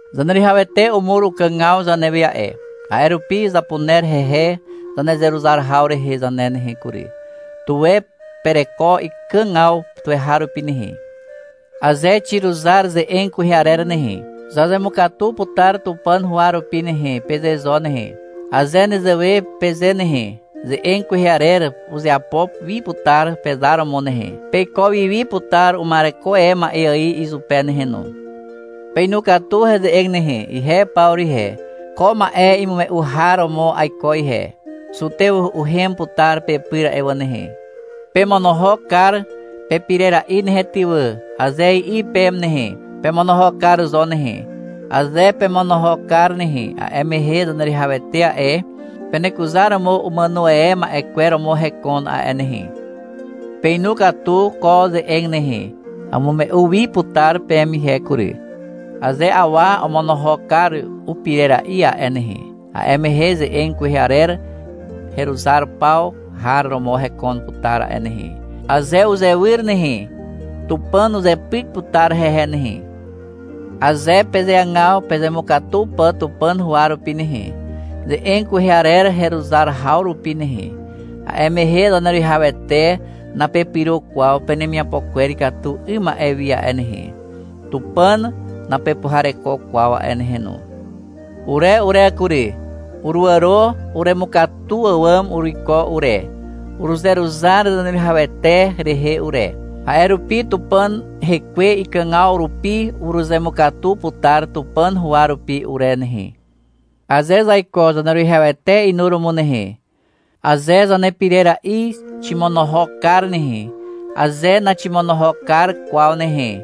Zaneruwihawete umur ukàgaw zanewe a'e, a'e rupi zapuner hehe zanezeruzar haw rehe zane nehe kury. Tuwe pereko ikàgaw tuweharupi nehe. — Aze xiruzar ze'eg kwehe arer nehe, zazemukatu putar Tupàn huwa rupi nehe, peze zo nehe. Aze nezewe peze nehe, ze'eg kwehe arer uzeapo wi putar pezar romo nehe. Peiko wi wi putar uma'ereko e ma'e ài izupe nehe no. Peinu katu heze'eg nehe. Ihe Pawru ihe, ko ma'e imume'u har romo aiko ihe. Zutew uhem putar pepyr a'e wà nehe. — Pemonohok kar pepirera'i nehe ty wà, aze i'i peme nehe, pemonohok kar zo nehe. Aze pemonohok kar nehe, a'e mehe Zaneruwihawete a'e, penekuzaromo umàno e ma'e kwer romo hekon a'e nehe. Peinu katu ko ze'eg nehe. Amume'u wi putar peme ihe kury. Aze awa omonohok kar upirera'i a'e nehe, a'e mehe ze'eg kwehe arer heruzar paw har romo hekon putar a'e nehe. Aze uzawy nehe, Tupàn uzepyk putar hehe nehe. Aze pezeagaw pezemukatu pà Tupàn huwa rupi nehe, ze'eg kwehe arer heruzar haw rupi nehe, a'e mehe Zaneruwihawete napepyro kwaw penemiapo kwer ikatu 'ym ma'e wi a'e nehe, Tupàn napepuhareko kwaw a'e nehe no. Ure ure kury, uruàro uremukatu àwàm uruiko ure. Uruzeruzar Zaneruwihawete rehe ure. A'e rupi Tupàn Hekwe ikàgaw rupi uruzemukatu putar Tupàn huwa rupi ure nehe. Aze zaiko Zaneruwihawete inuromo nehe, aze zanepirera'i ximonohok kar nehe, aze naximonohok kar kwaw nehe,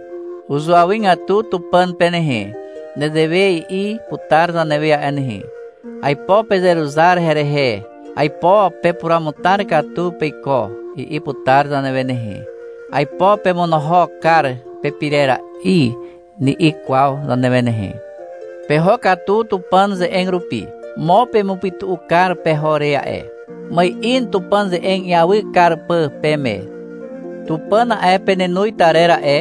uzuawygatu Tupàn pe nehe. Nezewe i'i putar zanewe a'e nehe. — Aipo pezeruzar herehe, aipo pepuruamutar katu peiko, i'i putar zanewe nehe. — Aipo pemonohok kar pepirera'i, ni'i kwaw zanewe nehe. Peho katu Tupàn ze'eg rupi. Mo pemupytu'u kar peho re a'e. Ma'in Tupàn ze'eg iawy kar pà peme. Tupàn a'e, penenoz tarer a'e,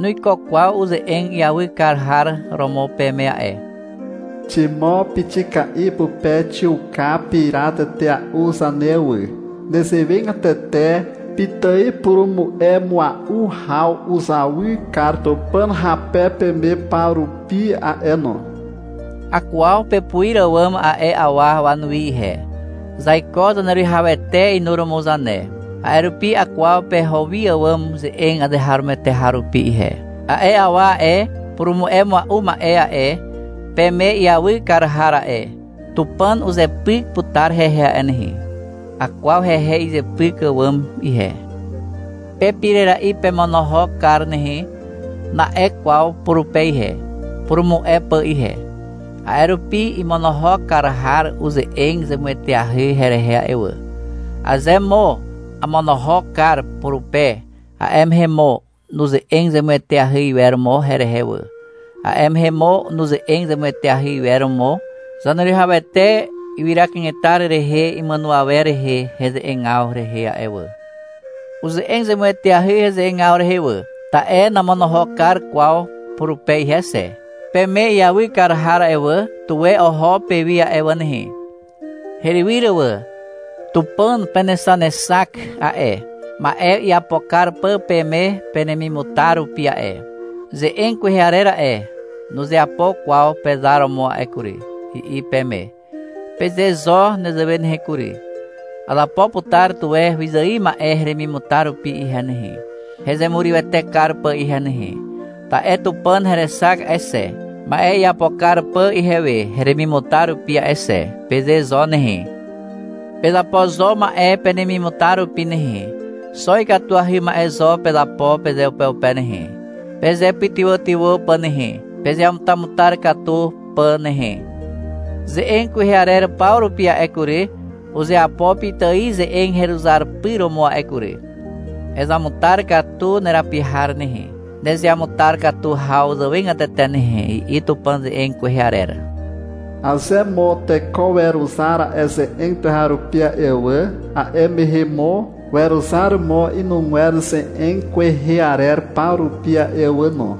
nuiko kwaw uze'eg iawy kar har romo peme a'e. Ximo pixika'i pupe xiuka pira tetea'u zane wà. Nezewegatete pitài purumu'e mua'u haw uzawy kar Tupàn hape peme paw rupi a'e no. Akwaw pepuir àwàm a'e awa wanuwi ihe. Zaiko Zaneruwihawete inuromo zane. A'e rupi akwaw peho wi àwàm ze'eg azeharomoete har rupi ihe. A'e awa a'e, purumu'e mua'u ma'e a'e, peme iawy kar har a'e, Tupàn uzepyk putar hehe a'e nehe. Akwaw hehe izepyk àwàm ihe. — Pepirera'i pemonohok kar nehe, na'e kwaw purupe ihe, purumu'e pà ihe. A'e rupi imonohok kar har uze'eg zemueteahy herehe a'e wà. Aze mo amonohok kar purupe, a'e mehe mo nuze'eg zemueteahy iwer mo herehe wà, a'e mehe mo nuze'eg zemueteahy iwer mo Zaneruwihawete ywyra kanetar rehe imàno awer rehe heze'egaw rehe a'e wà. Uze'eg zemueteahy heze'egaw rehe wà, ta'e namonohok kar kwaw purupe ihe xe. Peme iawy kar har a'e wà, tuwe oho pewi a'e wà nehe. Herywyr wà. Tupàn penexanexak a'e, ma'e iapo kar pà peme penemimutar rupi a'e. — Ze'eg kwehe arer nuzeapo kwaw pezar romo a'e kury, i'i peme. Peze zo nezewe nehe kury. — Azapo putar tuwe wyzài ma'e heremimutar rupi ihe nehe, hezemurywete kar pà ihe nehe, ta'e Tupàn herexak a'e xe, ma'e iapo kar pà ihewe heremimutar rupi a'e xe, peze zo nehe. Pezapo zo ma'e penemimutar rupi nehe. Xo ikatuahy ma'e zo pezapo pezeupeupe nehe, pezepytywàtywà pà nehe, pezeamutamutar katu pà nehe. — Ze'eg kwehe arer paw rupi a'e kury, uzeapo pitài ze'eg heruzar pyr romo a'e kury. Ezamutar katu nerapi har nehe, nezeamutar katu haw zàwegatete nehe, i'i Tupàn ze'eg kwehe arer. Aze mo teko weruzar a'e ze'eg tuweharupi a'e wà, a'e mehe mo weruzar mo inugwer ze'eg kwehe arer paw rupi a'e wà no.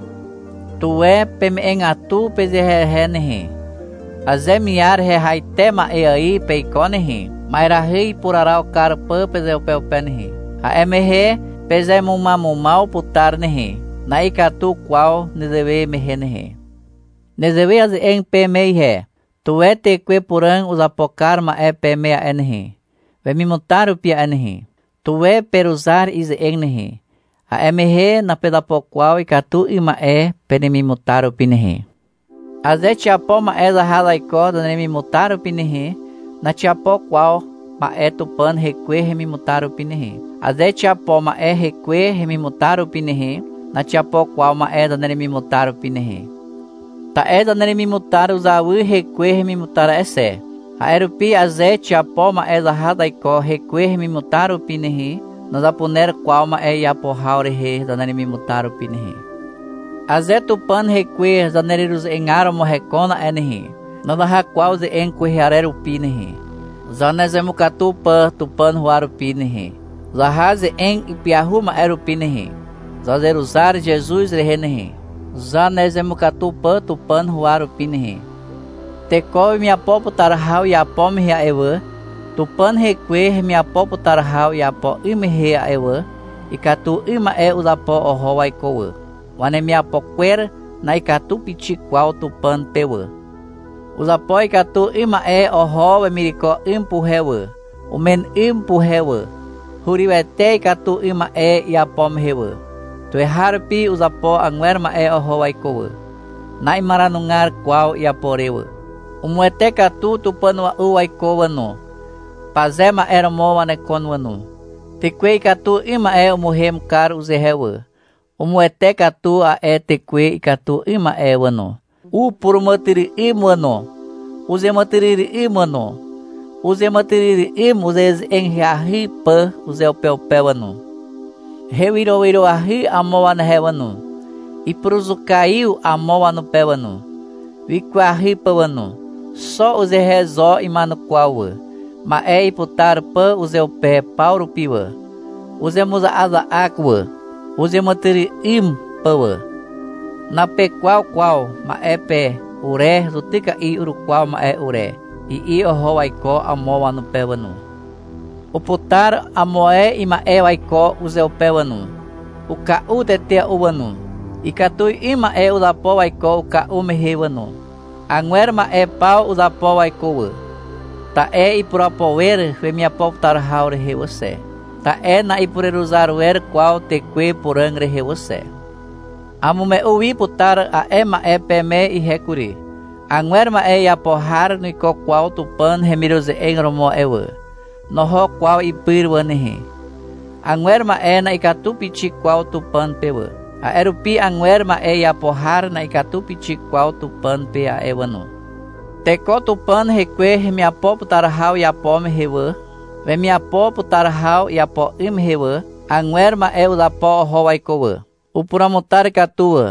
Tuwe peme'egatu pezehezehe nehe. Aze miar hehaite ma'e ài peiko nehe, ma'erahy ipuraraw kar pà pezeupeupe nehe, a'e mehe pezemumamumaw putar nehe. Na'ikatu kwaw nezewe mehe nehe. Nezewe aze'eg peme ihe. Tuwe Tekwe Puràg uzapo kar ma'e peme a'e nehe, wemimutar rupi a'e nehe. Tuwe peruzar ize'eg nehe. A'e mehe napezapo kwaw ikatu 'ym ma'e penemimutar rupi nehe. Aze xiapo ma'e zaha zaiko zaneremimutar rupi nehe, naxiapo kwaw ma'e Tupàn Hekwe hemimutar rupi nehe. Aze xiapo ma'e hekwe hemimutar rupi nehe, naxiapo kwaw ma'e zaneremimutar rupi nehe. Ta'e zaneremimutar uzawy hekwe hemimutar a'e xe. A'e rupi aze xiapo ma'e zaha zaiko hekwe hemimutar rupi nehe, nazapuner kwaw ma'e iapo haw rehe zaneremimutar rupi nehe. Aze Tupàn Hekwe zanereruze'egar romo hekon a'e nehe, nazaha kwaw ze'eg kwehe arer rupi nehe, zanezemukatu pà Tupàn huwa rupi nehe. Zaha ze'eg ipyahu ma'e rupi nehe. Zazeruzar Zezuz rehe nehe, zanezemukatu pà Tupàn huwa rupi nehe. Teko wemiapo putar haw iapo mehe a'e wà, Tupàn Hekwe hemiapo putar haw iapo 'ym mehe a'e wà, ikatu 'ym ma'e uzapo oho waiko wà. Wanemiapo kwer na'ikatu pixik kwaw Tupàn pe wà. Uzapo ikatu 'ym ma'e oho wemireko 'ym puhe wà, umen 'ym puhe wà. Hurywete ikatu 'ym ma'e iapo mehe wà. Tuweharupi uzapo agwer ma'e oho waiko wà. Na'imaranugar kwaw iapo re wà. Umuwete katu tupàn a'ua'u waiko wà no. Paze ma'e romo wanekon wà no. Tekwe ikatu 'ym ma'e umuhem kar uzehe wà, umuwete katu a'e tekwe ikatu 'ym ma'e wà no. Upuràmàtyry'ym wà no. Uzeàmàtyry'ym wà no. Uzeàmàtyry'ym uze'eze'eg ahyahy pà uzeupeupe wà no. Hewyrowyroahy amo wanehe wà no. Ipuruzukaiw amo wanupe wà no, wikwahy pà wà no. Xo uzehe zo ima'enukwaw wà, ma'e iputar pà uzeupe paw rupi wà. Uzemuza'aza'ak wà, uzeàmàtyry'ym pà wà. — Napekwaw kwaw ma'e pe, ure zutyka'i urukwaw ma'e ure, i'i oho waiko amo wanupe wà no. Uputar amo ae ima'e waiko uzeupe wà no. Uka'u tetea'u wà no. Ikatu 'ym ma'e uzapo waiko uka'u mehe wà no. Agwer ma'e paw uzapo waiko wà, ta'e ipurapo wer wemiapo putar haw rehe wà xe, ta'e na'ipureruzar wer kwaw Tekwe Puràg rehe wà xe. Amume'u wi putar a'e ma'e peme ihe kury. Agwer ma'e iapo har nuiko kwaw Tupàn hemiruze'eg romo a'e wà. Noho kwaw ipyr wà nehe. Agwer ma'e na'ikatu pixik kwaw Tupàn pe wà. A'e rupi agwer ma'e iapo har na'ikatu pixik kwaw Tupàn pe a'e wà no. Teko Tupàn Hekwe hemiapo putar haw iapo mehe wà, wemiapo putar haw iapo 'ym mehe wà, agwer ma'e uzapo oho waiko wà. Upuruamutar katu wà.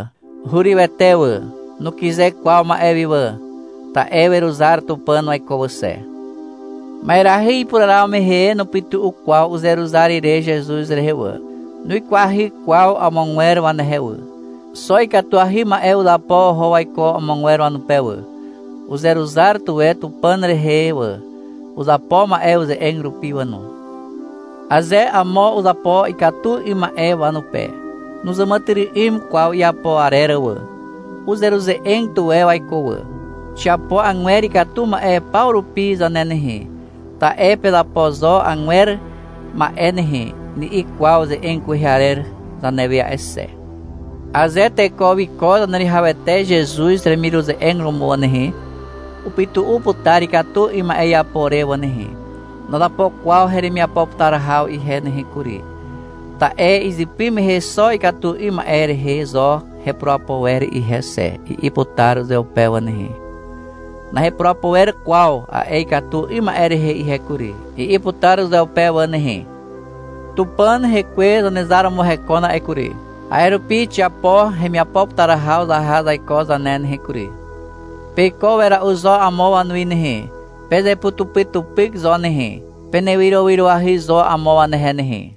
Hurywete wà. Nukyze kwaw ma'e wi wà, ta'e weruzar Tupàn waiko wà xe. Ma'erahy ipuraraw mehe nupytu'u kwaw uzeruzar ire Zezuz rehe wà. Nuikwahy kwaw amogwer wanehe wà. Xo ikatuahy ma'e uzapo oho waiko amogwer wanupe wà. Uzeruzar tuwe Tupàn rehe wà. Uzapo ma'e uze'eg rupi wà no. Aze amo uzapo ikatu 'ym ma'e wanupe, nuzàmàtyry'ym kwaw iapo arer wà. Uzeruze'eg tuwe waiko wà. Xiapo agwer ikatu ma'e paw rupi zane nehe, ta'e — Pezapo zo agwer ma'e nehe, ni'i kwaw ze'eg kwehe arer zanewe a'e xe. Aze teko wiko Zaneruwihawete Zezuz hemiruze'eg romo wà nehe, upytu'u putar ikatu 'ym ma'e iapo re wà nehe. — Nazapo kwaw heremiapo putar haw ihe nehe kury, ta'e izypy mehe xo ikatu 'ym ma'e rehe zo hepurapo wer ihe xe, i'i putar uzeupe wà nehe. — Nahepurapo wer kwaw a'e ikatu 'ym ma'e rehe ihe kury, i'i putar uzeupe wà nehe. Tupàn Hekwe Zanezar romo hekon a'e kury. A'e rupi xiapo hemiapo putar haw zaha zaiko zane nehe kury. Peiko wera'u zo amo wanuwi nehe. Pezeputupytupyk zo nehe. Penewyrowyroahy zo amo wanehe nehe.